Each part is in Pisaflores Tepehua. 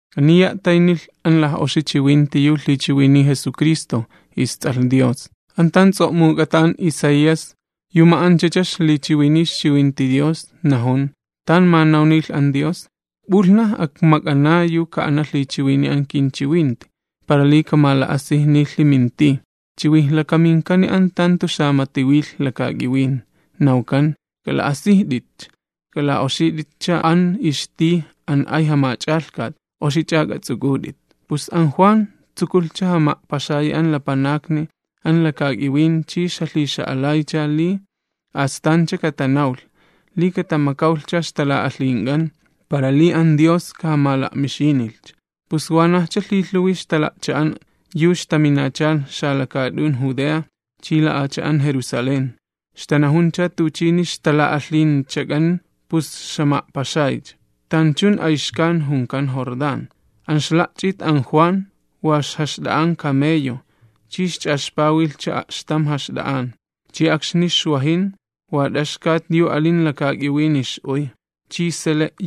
Aniya a'taynilh an laj'oxi chiwinti yu lhichiwiniy Jesucristo, isTs'alh Dios. An tan ts'o'muk'ata an Isaías, yu ma'anchacha ixlichiwiniy ixchiwinti Dios, najun, tan manawnilh an Dios: P'ulhnaj akmak'ana yu ka'ana lhichiwiniy an kinchiwinti para li kamala'asijnilhi min tij. Chiwijlakaminkani an tan jantu xamati wilh lakak'iwin, nawkan: “K'ala'asijt'itcha, k'ala'oxit'itcha an ixtij an ay Jamach'alhkat, oxich'a k'ats'uk'ut'it.” Pus an Juan, tsukulhcha jama'paxayi an lapanakni an lakak'iwin chi ixjalhixa'alaycha li katamakawlhcha ixtala'alhink'an para li an Dios kajamala'mixiynilhcha. Pus wanajcha lhilhuwi ixtala'cha'an yu ixtaminachalh xalakaat'un Judea chi la'acha'an Jerusalén. Ixtanajuncha tuchini ixtala'alhinchak'an pus ixjama'paxaycha, tanchun ayxkan junkan Jordán. An ixla'ch'it an Juan wa ixla'ach'awt camellojo ixla'oxiynikanta chi ixch'axpawilhcha a'xtam jaxt'a'an. Chi akxni xwajin wa t'axkat yu alin lakak'iwini ix'uy, chi sele'.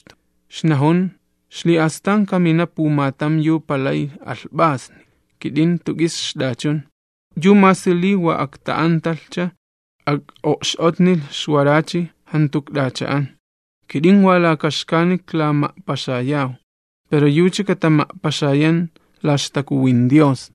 Ixnajun: ―Xli'astan kamina pumatam yu palay alhp'asni, kit'in jantu k'is ixt'achun, yucha masi li wa akta'antalhcha ak'o'x'otnilh ixwarachi, jantu ikt'acha'an. Kit'in wa laka xkani iklama'paxayaw pero yucha katama'paxayan la ixTakuwin Dios.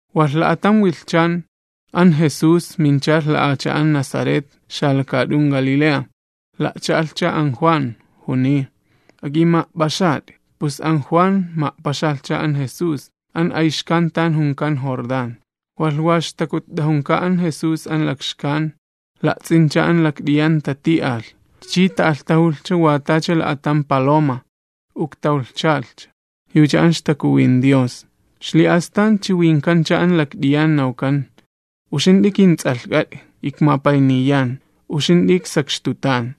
Walh la'atam wilhchan an Jesús minchalh la'acha'an Nazaret xalakaat'un Galilea. La'cha'alhcha an Juan, juniy: ―Ak'ima'p'axat'i. Pus an Juan ma'paxalhcha an Jesús, an ayxkan tan junkan Jordán. Walh wa ixtakutt'ajunka an Jesús an lakxkan, la'ts'incha an lakt'iyan tati'alh, chi ta'alhtajulhcha wa tacha la'atam paloma, tan ixyalh, yucha an ixtakuwin Dios. Xli'astan chiwinkancha an lakt'iyan nawkan: ―Uxint'i kinTs'alhk'at'i, ikmapayniyan. Uxint'i k'ima'an'ach'ay.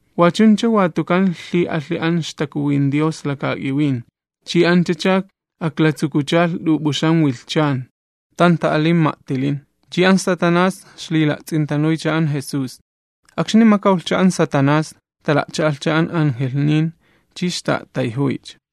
Wa chuncha watukan lhi'alhi an ixtakuwin Dios lakak'iwin, chi anchacha aklatsukuchalh t'up'uxam wilhchan, tan ta'alin ma'tilin. Chi an Satanás ixlila'ts'intanuycha an Jesús. Akxni makawlhcha an Satanás, tala'cha'alhcha an angelhnin chi ixtatapatsaniycha.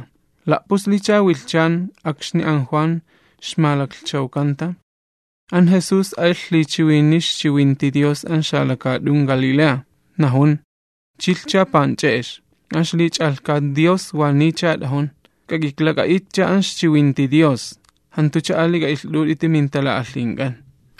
La'puslicha wilhchan akxni an Juan ixmalaklhchawkanta, an Jesús alh lhichiwiniy ixchiwinti Dios an xalakaat'un Galilea. Najun: ―Chilhcha panch'e'ex, an ixlich'alhkat Dios waniycha minta, k'ak'iklak'a'itcha an ixchiwinti Dios jant'uch'a ali k'a'ilht'ut'iti mintala'alhink'an.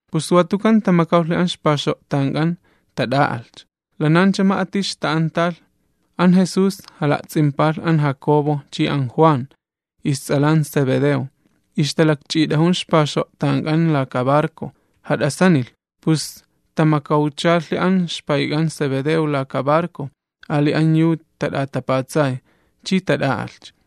Pus watukan tamakawlhi an ixpaxo'tank'an, chi tat'a'alhcha. Lanancha ma'ati ixta'antalh, an Jesús jala'ts'impalh an Jacobo chi an Juan, ists'alan Zebedeo, ixtalakch'it'ajun ixpaxo'tank'an laka barco. Jat'asanilh, pus tamakawchalhi an ixpayk'an Zebedeo laka barco ali an yu tat'atapatsay, chi tat'a'alhcha.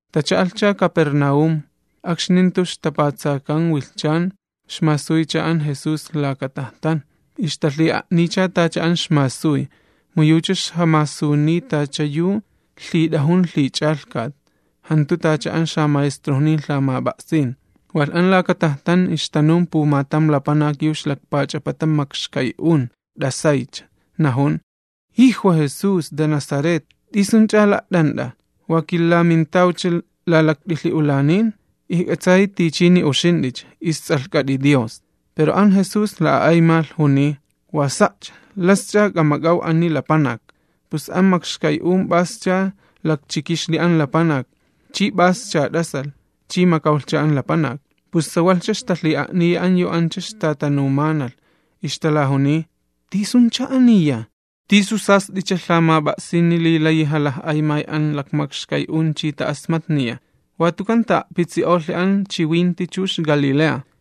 Tacha'alhcha Capernaúm. Chi akxni jantu ixtapatsakan wilhchan ixmasuycha an Jesús an laka cha'a yu puta'ayxto'kan. Ixtalhi'a'niycha tacha an ixmasuy, mu yucha ixjamasuniy tachanu yu lhit'ajun lhich'alhkat, jantu wa tacha an xamaestrojnincha lhamap'a'sin. Walh an laka tajtan ixtanun pumatam lapanak yu ixlakpach'apata makxkay'un, t'asaycha, najun: ―¡Jijwa! Jesús de Nazaret, ¿t'isunch'a la't'ant'a? ¿Wa kilamintawcha lalakt'ilhi'ulanin? Kit'in ikmispayan, uxint'i Stalan'a ixlapanak Dios. Pero an Jesús la'a'aymalh, juniy: ―¡Wa sa'cha! ¡Lasch'a k'amak'aw ani lapanak! Pus an makxkay'un p'ascha lakchikixli an lapanak, chi p'ascha t'asalh, chi makawlhcha an lapanak. Pus sawalhcha ixtalhi'a'niya an yu ancha ixtatanumanalh, ixtalajuniy: ―¿Tisuncha aniya? ¿Tisu sast'icha lhamap'a'sini li layi jalaj'aymay an makxkay'un chi ta'asmatniya? Watukan ta'a'pitsi'olhi an chiwinti chux Galilea.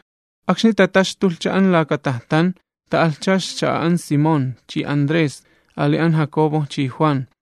Akxni tataxtulhcha an laka tajtan, ta'alhcha ixcha'a an Simón chi Andrés, ali an Jacobo chi Juan.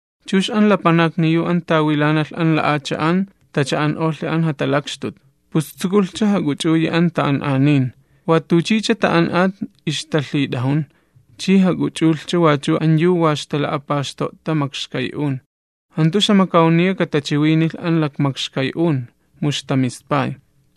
Chux an lapanakni yu an tawilanalh an la'acha'an tacha'an'olhi an jatalakxtut. Pus tsukulhcha jak'uch'uyi an ta'an'anin, watuchicha ta'an'at ixtalhit'ajun, chi jak'uch'ulhcha wachu an yu wa ixtala'apaxto'ta makxkay'un, jantu ixjamakawniya katachiwinilh an lakmakxkay'un, mu ixtamispay.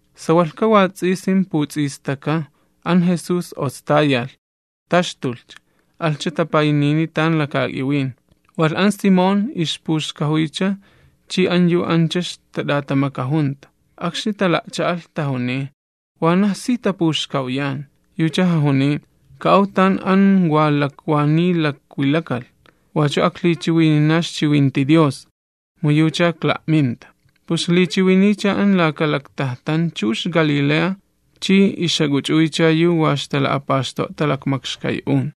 Sawalhka wats'isin puts'istaka an Jesús ostayalh, taxtulhcha, alhcha tapaynini tan lakak'iwin. Walh an Simón ixpuxkajuycha chi an yu ancha ixtat'atamakajunta. Akxni tala'cha'alh tajuniy: ―Wanaj si tapuxkawyan. Yucha jajuniy: ―Ka'aw an tan wa lakwaniy lakwilakalh wachu aklhichiwinina ixchiwinti Dios, mu yucha ikla'minta. Pus ixlichiwiniycha an laka lakcha'a yu ixpula'ta'ayxto'kan, chux Galilea, chi ixjak'uch'uycha an yu wa ixtala'apaxto'ta lakmakxkay'un.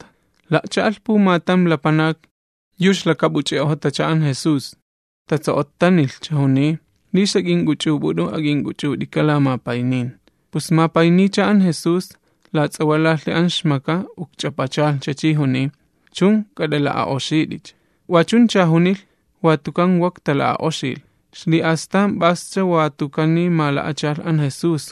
La'cha'alh pumatam lapanak yu ixlakap'uch'i'ojotacha, an Jesús, tatso'ottanilhcha juniy: ―Li sna ak'ink'uch'up'ut'u, ak'ink'uch'ut'ika'. Pus mapayniycha an Jesús, lats'awalalhi an ixmaka chi lakpach'apachalhcha, juniy: ―Chun, k'at'ala'a'oxit'icha. Wachuncha junilh, watukan wak tala'a'oxilh. Xli'astan p'ascha watukani mala'achalh an Jesús.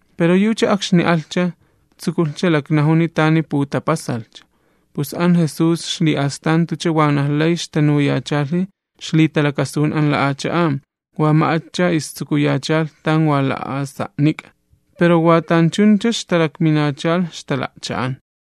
Pero yucha akxni alhcha, tsukulhcha laknajuni tani putapasalhcha, pus an Jesús xli'astan jantucha wanaj lay ixtanuyachalhi ixlitalakasun an la'acha'an, wa ma'atcha istsukuyachalh tan wa la'asa'nik'a, pero wa tanchuncha ixtalakminachalh ixtala'cha'an.